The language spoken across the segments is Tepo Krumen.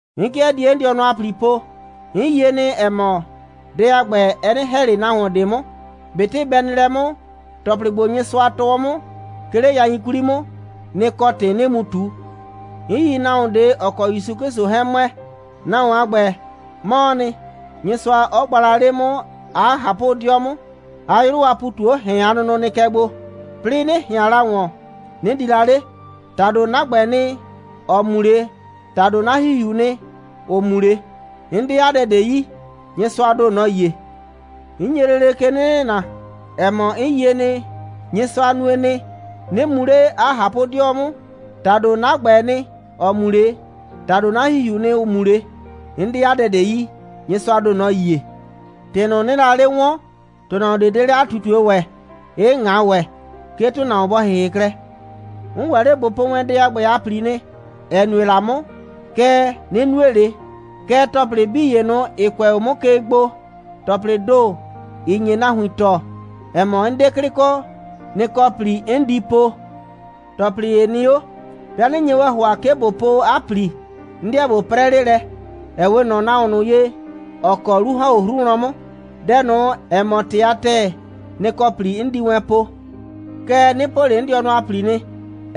'N 'kɩɛ die 'n dɩɔnʋ a ‑pli po. 'N yie nɩ, ‑ɛ mɔ, dɛ a ‑gbɛ, ɛ 'nɩ ‑hɛ ꞊le nahuon ꞊de 'mʋ. ꞊Betɩ bɛ nɩ lɛ 'mʋ, ‑tɔplɩ ‑gbo, Nyɩsʋa tɔɔ 'mʋ, 'ke 'le yain 'kwli 'mʋ, nɩ‑ kɔ ‑tɩ 'nɩɩ mu ꞊tu. 'N yi nahuon ꞊de, ‑ɔ kɔ ‑Yusu 'Klɩsʋ 'hɛɛn ‑mʋɛ. Nahuon a ‑gbɛ, 'mɔɔ nɩ; Nyɩsʋa 'ɔ gba la 'le 'mʋ 'a ꞊hapʋ'dɩɔ 'mʋ, 'a 'yrʋ a ‑pu ꞊tu 'o ‑hɛn a nʋnʋ nɩ kɛ gbo, 'plɩɩ 'nɩ ꞊hɩan la ‑wɔn, 'nɩ di la 'le. ‑Tado 'na ‑gbɛɛ nɩ, ‑ɔ mu 'le, ‑tado 'na ‑hihiuu nɩ, ‑ʋ mu 'le. 'N 'de 'a dɛ ꞊de yi. Nyɩsʋaa ‑do, nɔ‑ yie. 'N nye lele ke 'nɩ nɩna, ‑ɛ mɔ, 'n yie nɩ, Nyɩsʋa nue nɩ, 'nɩ mu 'le 'a ꞊hapʋ'dɩɔ 'mʋ. ‑Tado 'na ‑gbɛɛ nɩ, ‑ɔ mu 'le, ‑tado 'na ‑hihiuu nɩ, ‑ʋ mu 'le. 'N 'de 'a dɛ ꞊de yi. Nyɩsʋaa ‑do, nɔ‑ yie. ‑Tɩ ꞊nʋ, 'nɩɩ la 'le 'wɔɔn, ‑tʋnahuon ꞊de 'de 'le 'a ꞊tutue ‑wɛ, 'ɩ ꞊ŋa ‑wɛ, 'ke ‑tʋnahuon bɔ ‑hɩhɩ klɛ. 'N ‑wɛ 'le ꞊bo po wɛn dɛ a ‑gbɛ a ‑pli nɩ, ‑ɛ nue la 'mʋ, kɛɛ, 'nɩ nue ꞊le. Kɛɛ, ‑tɔplɩ 'bii ‑ye ꞊nʋ, ‑ɩ kʋɛ 'o 'mʋ ke gbo, ‑tɔplɩɩ ‑do, ‑ɩ nye nahuin tɔɔ, ‑ɛ mɔ, 'n 'de 'klɩ kɔ, nɩ‑ kɔ ‑pli 'n di po. ‑Tɔplɩ ‑ye nɩ 'o. 'Bɩa 'nɩ nye wɛn ‑hʋa, 'ke ꞊bo po 'a ‑pli, 'n 'deɛ ꞊bo 'prɛ 'le lɛ, ‑ɛ 'we ꞊nɔ nahuon ꞊nʋ ye, ‑ɔ kɔ 'lu ‑hɔn 'o 'hru wlɔn 'mʋ. Dɛ ꞊nʋ, ‑ɛ mɔ ‑tɩ a ‑tɛɛ, nɩ‑ kɔ ‑pli 'n di wɛn po. Kɛɛ, 'nɩ po ꞊le 'n dɩɔnʋ a ‑pli nɩ,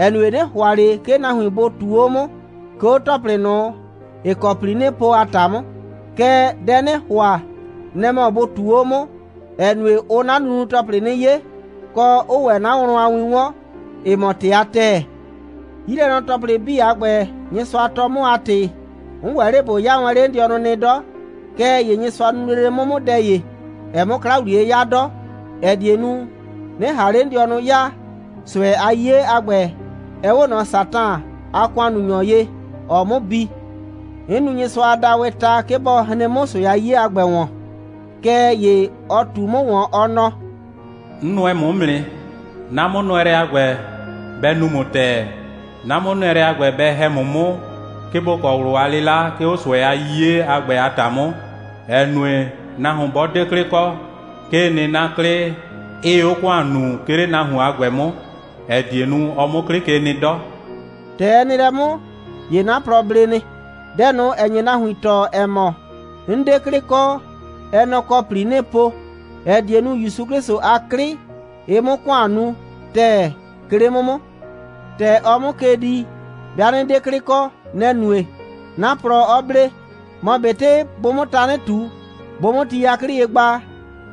‑ɛ nue, 'nɩ ‑hʋa ꞊le 'ke nahuin bʋ ꞊tuu 'o 'mʋ, 'ke 'o ‑tɔplɩ ꞊nʋ, ‑ɩ kɔ ‑pli 'nɩɩ po a ‑ta 'mʋ. Kɛɛ, dɛ 'nɩɩ ‑hʋa, nɛ‑ mɔ bʋ ꞊tuu 'o 'mʋ, ‑ɛ nue, ʋʋ 'na nunu‑tɔplɩ 'nɩ 'ye, kɔ, 'ʋʋ ‑wɛ 'na wlɔn a win 'wɔn, ‑ɩ mɔ ‑tɩ a ‑tɛɛ. 'Yilɛnɔ‑tɔplɩ 'bii a ‑gbɛ, Nyɩsʋa tɔɔ 'mʋ a ‑tɩ, 'n ‑wɛ 'le ꞊bo 'yaa wɛn 'le 'n dɩɔnʋ nɩ 'dɔ. Kɛɛ ‑ye Nyɩsʋa nu lele 'mʋ 'mʋ dɛ ‑ye, 'ɛɛ 'mʋ 'kla ‑wliye 'yaa 'dɔ, ‑ɛ die nu, 'nɩ ꞊han 'le 'n dɩɔnʋ 'yaa. ꞊Sʋɛ a 'yiye a ‑gbɛ, ɛ 'we ꞊nɔ Satan a ‑kʋannunyɔ ye, ‑ɔɔ 'mʋ bi. 'N nu Nyɩsʋa a daawɩɩ ta, 'ke bɔ hren 'mʋ ꞊sʋɛ a 'yiye a ‑gbɛ ‑wɔn, kɛɛ ‑ye ɔ ꞊tu 'mʋ ‑wɔn, ɔ nɔ: «'N nʋɛ ‑mʋ 'mʋ nɩ. 'Na 'mʋnʋɛlɛ a ‑gbɛ, bɛ nu ‑mʋ ‑tɛɛ. 'Na 'mʋnʋɛlɛ a ‑gbɛ, bɛ ‑hɛ ‑mʋ 'mʋ, 'ke ‑bo kɔ ꞊wlʋ a 'lɩla, 'ke 'o ꞊sʋɛ a 'yiye a ‑gbɛ a ‑ta 'mʋ, ‑ɛ nue, nahuon 'bɔ 'de 'klɩ kɔ, 'kee nɩ, 'na 'klɩ, 'ɩɩ 'o ‑kʋan nuu, 'ke 'le nahuon a ‑gbɛ 'mʋ, ‑ɛ die nu, ɔ 'mʋ 'klɩ ke nɩ 'dɔ.» ‑Tɛ ɛ nɩ lɛ 'mʋ, ‑ye 'na plɔ ble nɩ. Dɛ ꞊nʋ, ‑ɛ nye nahuin tɔɔ, ‑ɛ mɔ, 'n 'de 'klɩ kɔ, ɛ nɛ‑ kɔ ‑pli 'nɩɩ po, ‑ɛ die nu, ‑Yusu 'Klɩsʋ a 'klɩ, ɩ 'mʋ ‑kʋan nu ‑tɛɛ, 'ke 'le 'mʋ 'mʋ. ‑Tɛ ɔɔ 'mʋ ke dii, 'bɩa 'nɩ 'de 'klɩ kɔ, nɛ‑ nue, 'na plɔ 'ɔ ble. Mɔ ꞊betɩ bʋʋ 'mʋ tanɩ ꞊tu, bʋʋ 'mʋ ti 'yaklɩ ye gba,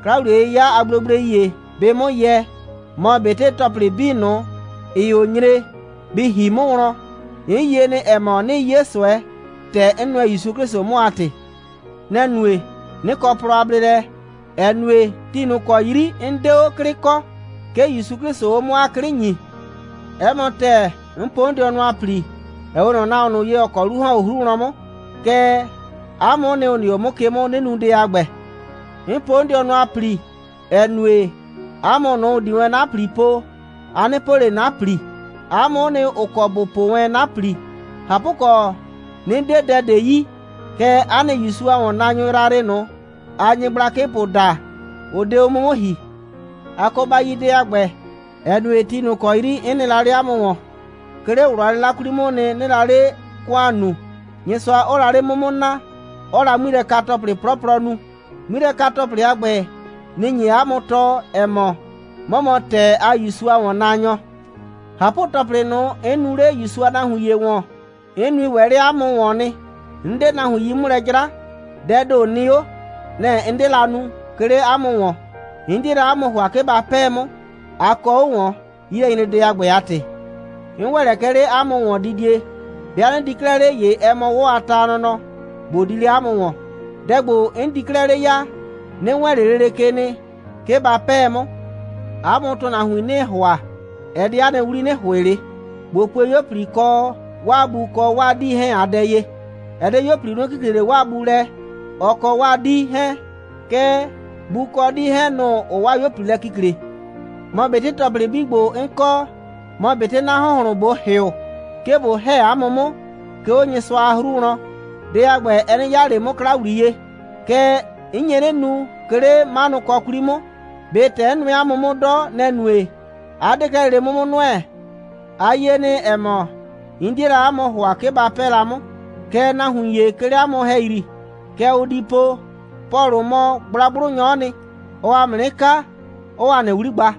'kla‑wliye'yɩya a gblegblei ‑ye bɩɩ 'mʋ yɛ, mɔ ꞊betɩ ‑tɔplɩ 'bii ꞊nʋ, ‑ɩɩ 'o nyre, bɩ ‑hi 'mʋ wlɔn, 'n yie nɩ, ‑ɛ mɔ, 'nɩɩ 'ye ꞊sʋɛ, ‑tɛ 'n nʋɛ ‑Yusu 'Klɩsʋ 'mʋ a ‑tɩ. Nɛ‑ nue, 'nɩ kɔ plɔ a bleelɛ, ‑ɛ nue, ti ꞊nʋ ‑kɔ 'yri, 'n 'de 'o 'klɩ kɔ, 'ke ‑Yusu 'Klɩsʋʋ 'o 'mʋ 'a 'klɩ ‑nyii. 'Ɛ mɔ ‑tɛɛ, 'n po 'n dɩɔnʋ a ‑pli, ‑ɛ 'we ꞊nɔ nahuon ꞊nʋ ye, ‑ɔ kɔ 'lu ‑hɔn 'o 'hru wlɔn 'mʋ. Kɛɛ, 'a mʋ'ʋ nɩ, ‑ʋ nɩ 'o 'mʋ ke 'mʋ, 'nɩ nu dɛ a ‑gbɛ. 'N po 'n dɩɔnʋ a ‑pli, ‑ɛ nue, 'a mʋ ꞊nʋ, ‑ʋ di wɛn 'na ‑pli po, a 'nɩ po ꞊le 'na ‑pli. 'A mʋ'ʋ nɩ, ‑ʋ kɔ ‑bʋ po wɛn 'na ‑pli. ꞊Hapʋkɔ, 'nɩ 'de dɛ ꞊de yi, kɛɛ, 'a nɩ ‑Yusu a ‑wɔnnaanyʋ yrayrɩ ꞊nʋ, aa nyɩgblakɩpʋ daa, ʋ 'de 'o 'mʋ 'mʋ ‑hi. A kɔ ba yi dɛ a ‑gbɛ, ‑ɛ nue, ti ꞊nʋ ‑kɔ 'yri 'n nɩ la 'le 'a mʋ ‑wɔn, 'ke 'le ꞊wlʋ a 'lɩla 'kwli 'mʋʋ nɩ, 'nɩɩ la 'le ‑kʋan nuu, Nyɩsʋa 'ɔɔ la 'le 'mʋ 'mʋ naa, 'ɔɔ la 'ŋmilɛka‑tɔplɩ 'plɔplɔ nu. 'Ŋmilɛka‑tɔplɩ a ‑gbɛ, nɩ‑ nye 'a mʋ tɔɔ, ‑ɛ mɔ, 'mɔ mɔ ‑tɛɛ a ‑Yusu a ‑wɔnnaanyɔ. ꞊Hapʋ‑tɔplɩ ꞊nʋ, 'n nuu 'le ‑Yusu a nahuin ‑ye ‑wɔn, 'n nui ‑wɛ 'le 'a mʋ ‑wɔn nɩ. 'N 'de nahuin 'yi 'mʋ lɛ 'jra. Dɛɛ ‑do nɩ 'o. Nɛ‑ 'n 'de la nu, 'ke 'le 'a mʋ ‑wɔn. 'N 'die la 'a mʋ ‑hʋa, 'ke ba 'pɛɛ 'mʋ. A kɔ 'o ‑wɔn, 'yilɛnyredɛ a ‑gbɛ a ‑tɩ. 'N ‑wɛ lɛ kɛ 'le 'a mʋ ‑wɔndidie. 'Bɩa 'nɩ di 'klɛɛ 'le, ‑ye ɛ mɔ 'wɔ a ta nɔnɔ, ꞊bo di 'le 'a mʋ ‑wɔn. Dɛ ‑gbo, 'n di 'klɛɛ 'le ya, 'nɩ wɛɛn ꞊le lele ke nɩ, 'ke ba 'pɛɛ 'mʋ. 'A mʋ ‑tʋnahuin 'nɩɩ ‑hʋa, ɛ 'de 'a nɩ 'wli, 'nɩ ‑hʋɩ ꞊le. ꞊Bo pue 'yuo꞊pli kɔ 'waa bu kɔ 'waa 'dii 'hɛɛn a dɛ ye. Ɛ 'de 'yuo꞊pli, ʋ 'nɩ kikle ꞊le 'waa bu lɛ, ɔ kɔ 'waa 'dii 'hɛɛn, kɛɛ, bu kɔ 'dii 'hɛɛn, nʋ‑ʋ 'waa 'yuo꞊pli lɛ kikle. Mɔ ꞊betɩ ‑tɔplɩ 'bii ‑gbo, 'n kɔ, mɔ ꞊betɩ 'na ‑hʋnhlʋn, ꞊bo ‑hɩʋ, 'ke ꞊bo ‑hɛ 'a mʋ 'mʋ, 'ke 'o Nyɩsʋa a 'hru wlɔn, dɛ a ‑gbɛ, ɛ 'nɩ 'yaa ꞊le 'mʋ 'kla ‑wliye, kɛɛ, 'n nye 'nɩ nu, 'ke 'le 'manʋkɔ 'kwli 'mʋ. ꞊Be ‑tɛ 'n nʋɛ 'a mʋ 'mʋ 'dɔ, nɛ‑ nue, 'a 'de 'klɛɛ lele 'mʋ 'mʋ nʋɛ? A yie nɩ, ‑ɛ mɔ, 'n 'die la 'a mʋ ‑hʋa, 'ke ba 'pɛɛ la 'mʋ. Kɛɛ, nahuin ‑ye, 'ke 'le 'a mʋ ‑hɛyri, kɛ ʋ di po: «Pɔlʋ mɔ gblagblʋnyɔ'ɔ nɩ. Ɔɔ ‑a mʋ 'nɩ kaa, 'ɔɔ ‑a nɩ 'wli gba.»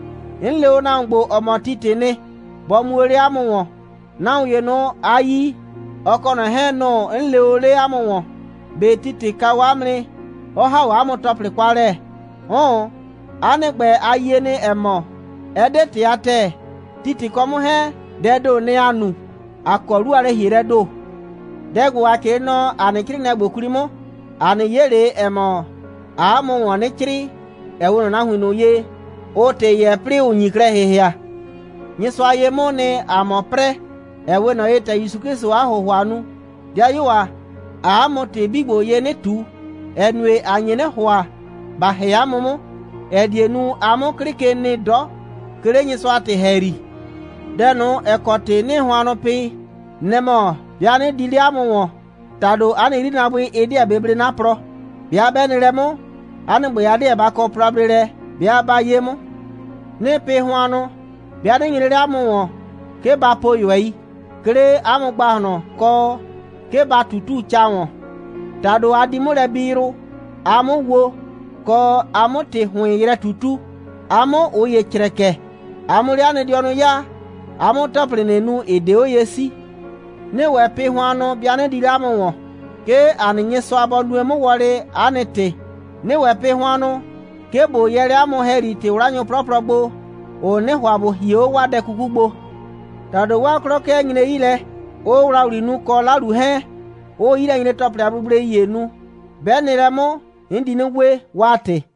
'N le o nahuon ‑gbo, ‑ɔ mɔ Titɩ nɩ, bɔ mu o 'le 'a mʋ ‑wɔn. Nahuon ‑ye ꞊nʋ, a yi, ɔ kɔ ꞊nɔ 'hɛɛn, nʋ‑ 'n lee o 'le 'a mʋ ‑wɔn. ꞊Be Titɩ kaa 'a mʋ nɩ, 'ɔ ‑ha 'a mʋ ‑tɔplɩ kwa lɛ? 'Ʋʋn. 'A nɩ ‑gbɛ, a yie nɩ, ‑ɛ mɔ, ɛ 'de ‑tɩ a ‑tɛɛ. Titɩ kɔ 'mʋ 'hɛɛn, dɛɛ ‑do, nɛ‑ ‑aa nu. ‑A kɔ 'lu a lɛ‑hielɛɛ ‑do. Dɛ ‑gbo, ‑a 'crɩɩ nɔ ‑a nɩ 'crɩɩnɩɛ ‑gbo 'kwli 'mʋ, a nɩ 'ye 'le, ‑ɛ mɔ, ‑aa 'a mʋ ‑wɔn 'nɩ 'crɩɩ, ‑ɛ 'we ꞊nɔ nahuin ꞊nʋ ye, ʋʋ ‑tɩ yɛɛ, 'plɩɩ ‑ʋ nyi klɛ ‑hɩhɩa. Nyɩsʋa ye 'mʋʋ nɩ, ‑aa mɔ 'prɛɛ, ‑ɛ 'we ꞊nɔ ‑ye, ‑tɛ ‑Yusu 'Klɩsʋʋ 'a ‑hʋhʋa nu. 'Dɩayuo ‑a, ‑aa 'a mʋ ‑tɩ 'bii ‑gbo ye 'nɩ ꞊tu, ‑ɛ nue, ‑a nye 'nɩ ‑hʋa, ‑ba ‑hɛ 'a mʋ 'mʋ, ‑ɛ die nu, a 'mʋ 'klɩ ke nɩ 'dɔ, 'ke 'le Nyɩsʋa a ‑tɩ ‑hɛyri. Dɛ ꞊nʋ, ‑ɛ kɔ ‑tɩ 'nɩɩ hʋannʋ pɩ, nɛ‑ mɔ, 'bɩa 'nɩ di 'le 'a mʋ ‑wɔn, ‑tado 'a nɩ 'yrinaabʋɩ, ɩ 'deɛ bɩ blee 'na plɔ. 'Bɩa 'bɛ nɩ lɛ 'mʋ, 'a nɩ ‑gbɛ, a 'deɛ ba kɔ plɔ a bleelɛ, 'bɩa 'ba 'ye 'mʋ. 'Nɩɩ pɩ hʋannʋ, 'bɩa 'nɩ nyre 'le 'a mʋ ‑wɔn, 'ke ba po ꞊yʋɛi, 'ke 'le 'a mʋ ‑gbahlɔn, kɔ, 'ke ba ꞊tutu ca ‑wɔn. ‑Tado a di 'mʋ lɛ bi yrʋ, a 'mʋ wo, kɔ, a 'mʋ ‑tɩ ‑hʋɩn yrɛ ꞊tutu, a 'mʋ ꞊ʋ ‑ye crɛkɛ, a 'mʋ 'le 'a nɩ dɩɔnʋ 'yaa, a 'mʋ ‑tɔplɩ ꞊nʋ nu, ‑ɩ 'de 'o ye 'sii. 'Nɩɩ ‑wɛ pɩ hʋannʋ, 'bɩa 'nɩ di 'le 'a mʋ ‑wɔn, 'ke ‑a nɩ Nyɩsʋa bɔ nue 'mʋ wɔlɩ, 'a nɩ ‑tɩ. 'Nɩɩ ‑wɛ pɩ hʋannʋ, 'ke ꞊bo yɛɛ 'le 'a mʋ ‑hɛyri ‑tɩ'wlanyʋ 'plɔplɔ gbo, ‑ʋ 'nɩnɩ ‑hʋa ‑bʋ hie 'o 'waa dɛ 'kuku gbo. ‑Tado 'waa 'klɔ 'kɩɛ nyree 'yi lɛ, 'ʋʋ ‑wlawli nu, kɔ 'lalu 'hɛɛn, 'ʋʋ 'yilɛnyre‑tɔplɩ a gblegblei ‑ye nu. 'Bɛ nɩ lɛ 'mʋ, 'n di 'nɩ we, 'waa ‑tɩ.